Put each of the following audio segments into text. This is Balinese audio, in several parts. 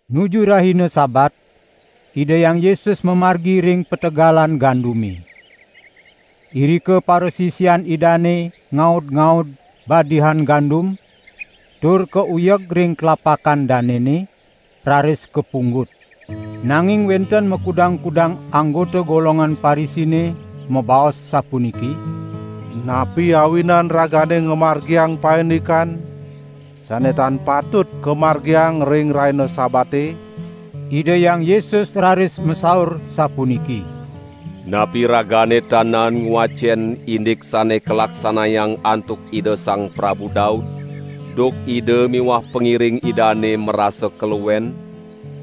Nuju rahina Sabat Ida Hyang Yesus mamargi ring pategalan gandume. Irika parasisian Idane ngaud-ngaud badihan gandum, tur kauyeg ring tlapakan danene, raris kapunggut. Nanging wenten makudang-kudang anggota golongan Parisine mabaos sapuniki: "Napi awinan ragane ngamargiang paindikan sane tan patut kamargiang ring rahina Sabate?" Ida Hyang Yesus raris masaur sapuniki: "Napi ragane tan naen ngwacen indik sane kalaksanayang antuk Ida Sang Prabu Daud, duk ida miwah pangiring idane marasa kaluen?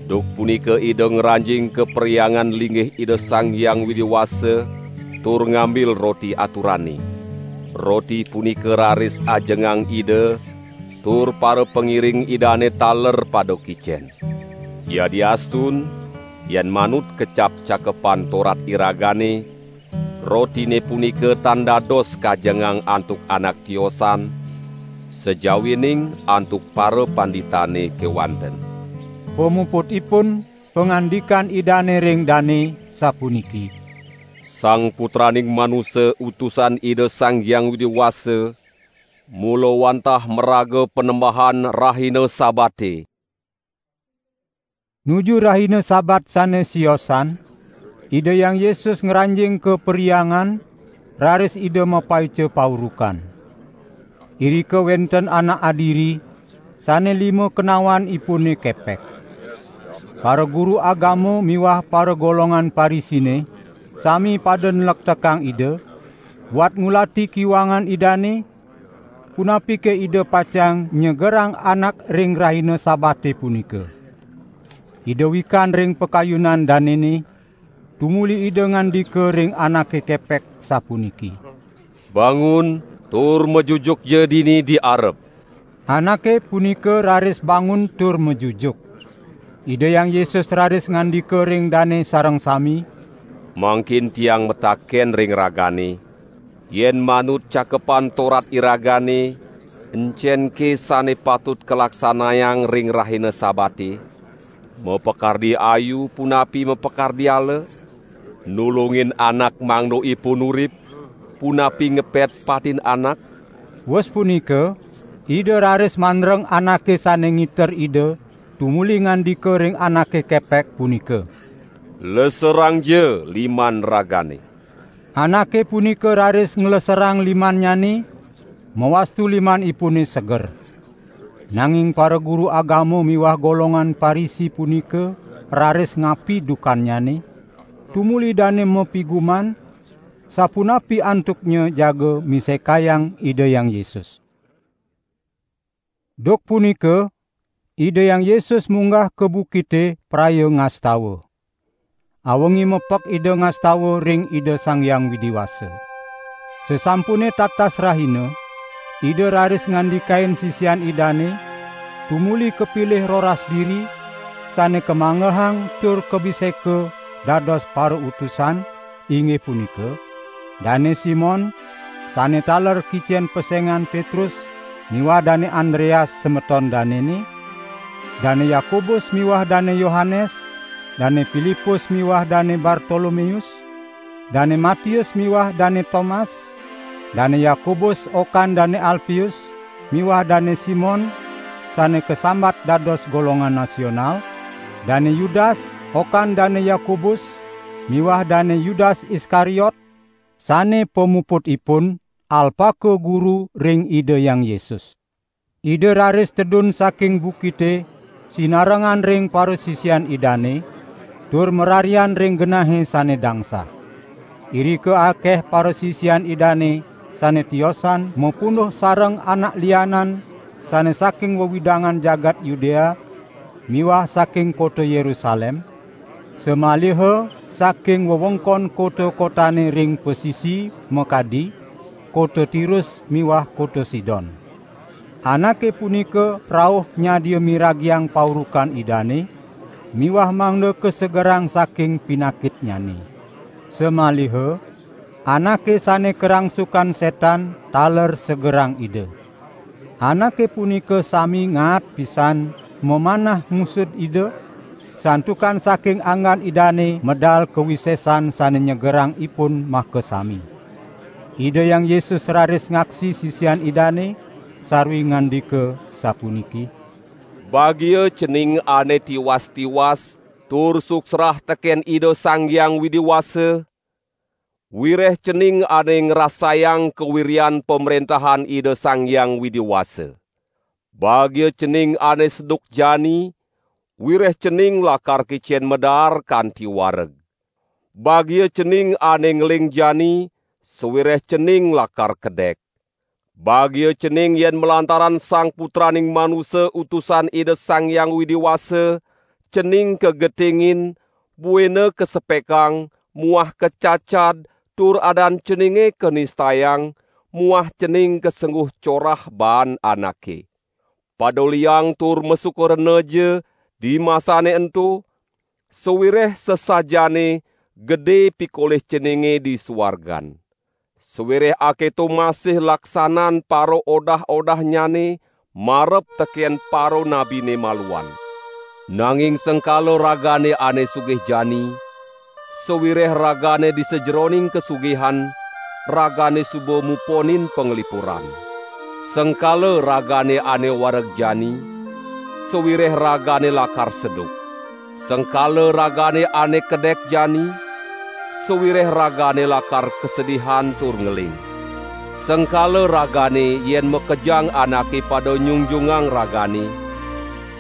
Duk punika ida ngranjing ka Perhyangan Linggih Ida Sang Hyang Widi Wasa tur ngambil roti aturane. Roti punika raris ajengang ida, tur parapangiring idane taler pada kicen. Yadiastun yen manut kecap Cakepan Torat iragane, rotine punika tan dados kajengang antuk anak tiosan, sajawining antuk parapanditane kewanten." Pamuputipun pangandikan Idane ring dane, sapuniki: "Sang Putraning Manusa Utusan Ida Sang Hyang Widi Wasa, mula wantah maraga Panembahan rahina Sabate." Nuju rahina Sabat sane siosan, Ida Hyang Yesus ngranjing ka perhyangan, raris Ida mapaica paurukan. Irika wenten anak adiri sane lima kenawanipune kepek. Paraguru agama miwah paragolongan Parisine sami pada nlektekang Ida, buat ngulati kiwangan Idane, punapike Ida pacang nyegerang anak ring rahina Sabate punika. Ida wikan ring pakayunan danene, tumuli Ida ngandika ring anake kepek sapuniki: "Bangun tur majujukja dini di arep!" Anake punika raris bangun tur majujuk. Ida Hyang Yesus raris ngandika ring dane sareng sami: "Mangkin Tiang mataken ring ragane: Yen manut Cakepan Torat iragane, encenke sane patut kalaksanayang ring rahina Sabate? Mapakardi ayu punapi mapakardi ala? Nulungin anak mangda ipun urip, punapi ngepet patin anak?" Wus punika Ida raris mandreng anake sane ngiter Ida tumuli ngandika ring anake kepek punika: "Leserangja liman ragane!" Anake punika raris ngleserang limannyane, mawastu limanipune seger. Nanging paraguru agama miwah golongan Parisi punika raris ngapi dukannyane, tumuli dane mapiguman, sapunapi antuknya jagi misekayang Ida Hyang Yesus. Duk punika Ida Hyang Yesus munggah ka bukite praya ngastawa. Awengi mepek Ida ngastawa ring Ida Sang Hyang Widi Wasa. Sasampune tatas rahina, Ida raris ngandikain sisian Idane, tumuli kapilih roras diri, sane kamanggehang tur kabiseka dados parautusan, inggih punika: Dane Simon, sane taler kicen pesengan Petrus miwah Dane Andreas semeton danene, Dane Yakobus miwah Dane Yohanes, Dane Pilipus miwah Dane Bartolomeus, Dane Matius miwah Dane Tomas, Dane Yakobus okan Dane Alpeus miwah Dane Simon sane kasambat dados golongan Nasional, Dane Yudas okan Dane Yakobus miwah Dane Yudas Iskariot, sane pamuputipun alpaka guru ring Ida Hyang Yesus. Ida raris tedun saking bukite sinarengan ring parasisian Idane, tur mararian ring genahe sane dangsah. Irika akeh parasisian Idane sane tiosan mapunduh sareng anak lianan sane saking wewidangan jagat Yudea miwah saking kota Yerusalem, samaliha saking wewengkon kota-kotane ring pasisi makadi: Kota Tirus miwah kota Sidon. Anake punika rauh nyadia miragiang paurukan Idane miwah mangda kasegerang saking pinakitnyane. Samaliha anake sane karangsukan setan taler segerang Ida. Anake punika sami ngaat pisan mamanah ngusud Ida, santukan saking anggan Idane medal kawisesan sane nyegerang ipun makasami. Ida Hyang Yesus raris ngaksi sisian Idane, sarwi ngandika, sapuniki: "Bagia cening ane tiwas-tiwas tur suksrah teken Ida Sang Hyang Widi Wasa, wireh cening ane ngrasayang kawiryan Pamrentahan Ida Sang Hyang Widi Wasa. Bagia cening ane seduk jani, wireh cening lakar kicen madaar kanti wareg. Bagia cening ane ngeling jani, sawireh cening lakar kedek. Bagia cening yen malantaran Sang Putraning Manusa Utusan Ida Sang Hyang Widi Wasa cening kagetingin buina kasepekang muah kacacad tur adan ceninge kanistayang muah cening kasengguh corah baan anake. Pada liang tur masuka renaja dimasane ento, sawireh sasajaane gede pikolih ceninge di suargan. Sawireh aketo masih laksanan paraodah-odahnyane marep teken paranabine maluan. Nanging sengkala ragane ane sugih jani, sawireh ragane di sajeroning kasugihan ragane suba muponin panglipuran. Sengkala ragane ane wareg jani, sawireh ragane lakar seduk. Sengkala ragane ane kedek jani, sawireh ragane lakar kasedihan tur ngeling. Sengkala ragane yen makejang anake pada nyungjungang ragane,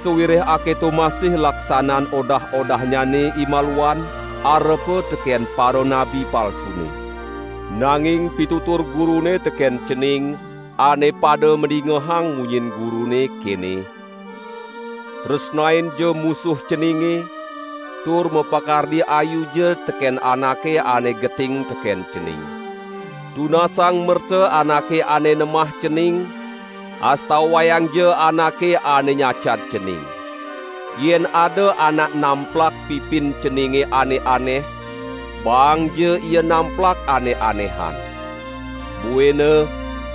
sawireh aketo masih laksanan odah-odahnyane imaluan arepa teken paranabi palsune." "Nanging pitutur Gurune teken cening, ane pada madingehang munyin Gurune, kene: Tresnainja musuh ceninge, tur mapakardi ayuja teken anake ane geting teken cening. Tunasang merta anake ane nemah cening, astawayangja anake ane nyacad cening. Yen ada anak namplak pipin ceninge ane aneh, baangja ia namplak ane anehan. Buina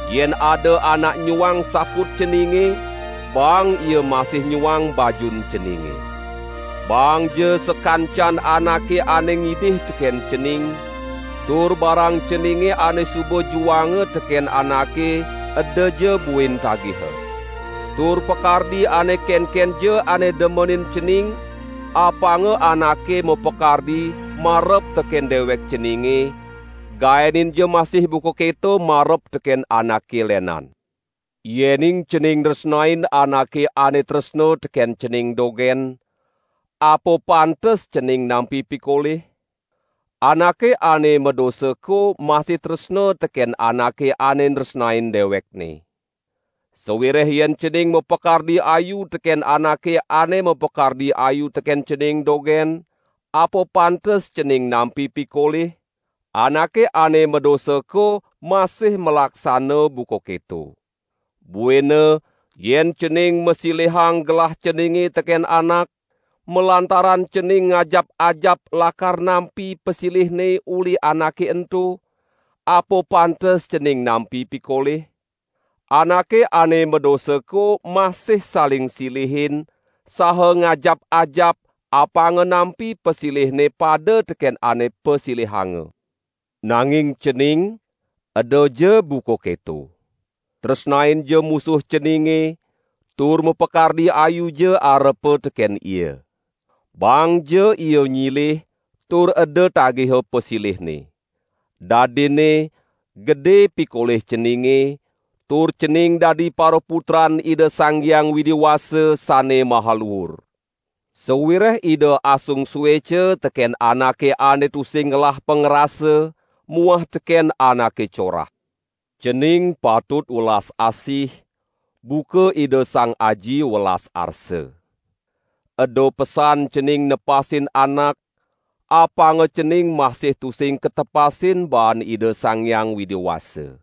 yen ada anak nyuang saput ceninge, baang ia masih nyuang bajun ceninge. Baangja sakancan anake ane ngidih teken cening, tur barang ceninge ane suba juanga teken anake edaja buin tagiha. Tur pakardi ane kenkenja ane demenin cening, apanga anake mapakardi marep teken dewek ceninge, gaeninja masih buka keto marep teken anake lenan. Yening cening nresnain anake ane tresna teken cening dogen, apa pantes cening nampi pikolih? Anake ane madosako masih tresna teken anake ane nresnain dewekne. Sawireh yen cening mapakardi ayu teken anake ane mapakardi ayu teken cening dogen, apa pantes cening nampi pikolih? Anake ane madosako masih malaksana buka keto. Buina yen cening masilihang gelah ceninge teken anak, malantaran cening ngajap-ajap lakar nampi pasilihne uli anake ento, apa pantes cening nampi pikolih? Anake ane madosako masih saling silihin, saha ngajap-ajap apanga nampi pasilihne pada teken ane pasilihanga. Nanging cening, edaja buka keto! Tresnainja musuh ceninge, tur mapakardi ayuja arepa teken ia. Baangja ia nyilih tur eda tagiha pasilihne. Dadinne gede pikolih ceninge, tur cening dadi paraputran Ida Sang Hyang Widi Wasa Sane Maha Luur. Sawireh Ida asung sueca teken anake ane tusing ngelah pangrasa muah teken anake corah. Cening patut welas asih buka Ida Sang Aji welas arsa." "Eda pesan cening nepasin anak, apanga cening masih tusing katepasin baan Ida Sang Hyang Widi Wasa.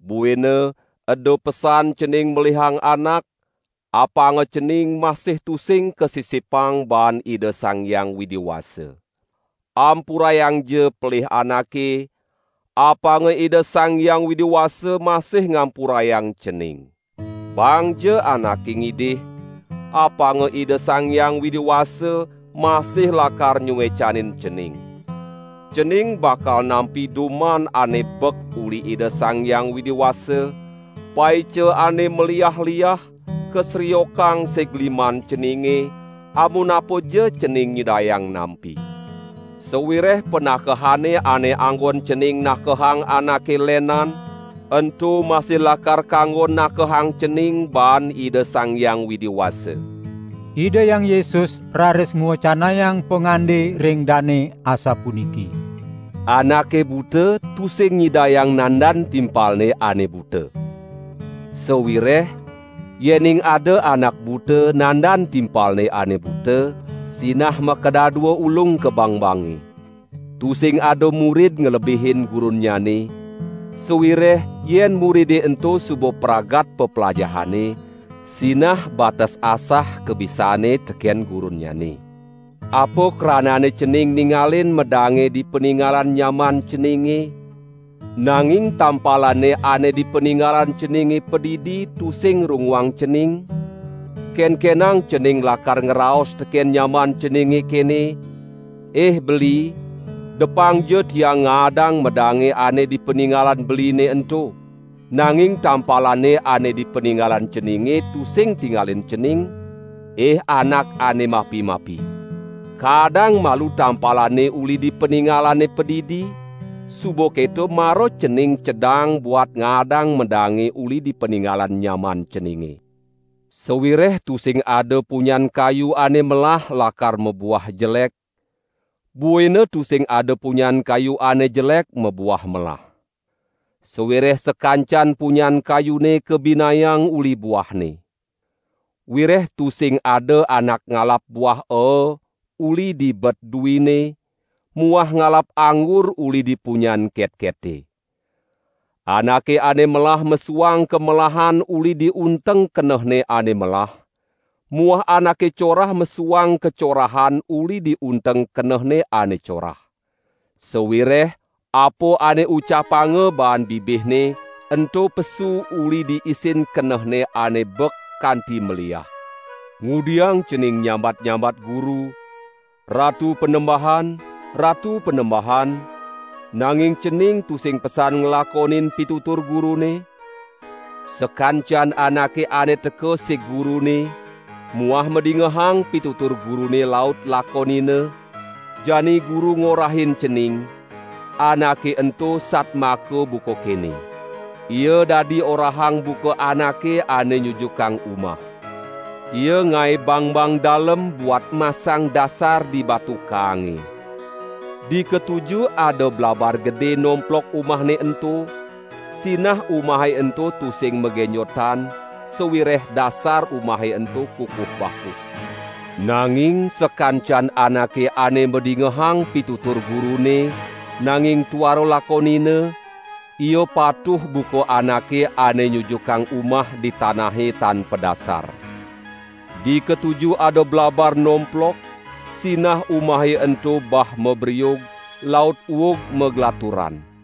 Buina eda pesan cening melihang anak, apanga cening masih tusing kasisipang baan Ida Sang Hyang Widi Wasa. Ampurayangja pelih anake, apanga Ida Sang Hyang Widi Wasa masih ngampurayang cening. Baangja anake ngidih, apanga Ida Sang Hyang Widi Wasa masih lakar nyuecanin cening. Cening bakal nampi duman ane bek uli Ida Sang Hyang Widi Wasa, paica ane maliah-liah, kasriokang sig liman ceninge, amunapaja cening nyidayang nampi. Sawireh panakehane ane anggon cening nakehang anake lenan, ento masih lakar kanggon nakehang cening baan Ida Sang Hyang Widi Wasa." Ida Hyang Yesus raris ngwecanayang pangande ring dane asapuniki: "Anake buta tusing nyidayang nandan timpalne ane buta. Sawireh yening ada anak buta nandan timpalne ane buta, sinah makadadua ulung ka bangbange. Tusing ada murid nglebihin gurunnyane, sawireh yen muride ento suba pragat peplajahanne, sinah bates asah kabisanne teken gurunnyane. Apa kranane cening ningalin medange di paningalan nyaman ceninge, nanging tampalane ane di paningalan ceninge padidi tusing runguang cening? Kenkenang cening lakar ngraos teken nyaman ceninge kene: Ih beli depangja tiang ngaadang medange ane di paningalan beline ento! Nanging tampalane ane di paningalan ceninge tusing tingalin cening? Ih anak ane mapi-mapi. Kaadang malu tampalane uli di paningalane padidi, suba keto mara cening cedang buat ngaadang medange uli di paningalan nyaman ceninge." "Sawireh tusing ada punyan kayu ane melah lakar mabuah jelek; buina tusing ada punyan kayu ane jelek mabuah melah. Sawireh sakancan punyan kayune kabinayang uli buahne. Wireh tusing ada anak ngalap buah aa uli di bet duine muah ngalap anggur uli di punyan ketkete. Anake ane melah mesuang kamelahan uli di unteng kenehne ane melah muah anake corah mesuang kacorahan uli di unteng kenehne ane corah. Sawireh apa ane ucapanga baan bibihne ento pesu uli di isin kenehne ane bek kanti maliah." "Ngudiang cening nyambat-nyambat Guru: 'Ratu Panembahan, Ratu Panembahan,' nanging cening tusing pesan nglakonin pitutur Gurune? Sakancan anake ane teka sig Gurune muah madingehang pitutur Gurune laut lakonina, jani Guru ngorahin cening, anake ento satmaka buka kene. Ia dadi orahang buka anake ane nyujukang umah. Ia ngae bangbang dalem buat masang dasar di batu kaange. Dikatuju ada blabar gede nomplok umahne ento, sinah umahe ento tusing magenjotan, sawireh dasar umahe ento kukuh bakuh. Nanging sakancan anake ane madingehang pitutur Gurune, nanging tuara lakonina, ia patuh buka anake ane nyujukang umah di tanahe tan padasar. Dikatuju ada blabar nomplok, sinah umahe ento bah mabriug, laut uug maglaturan."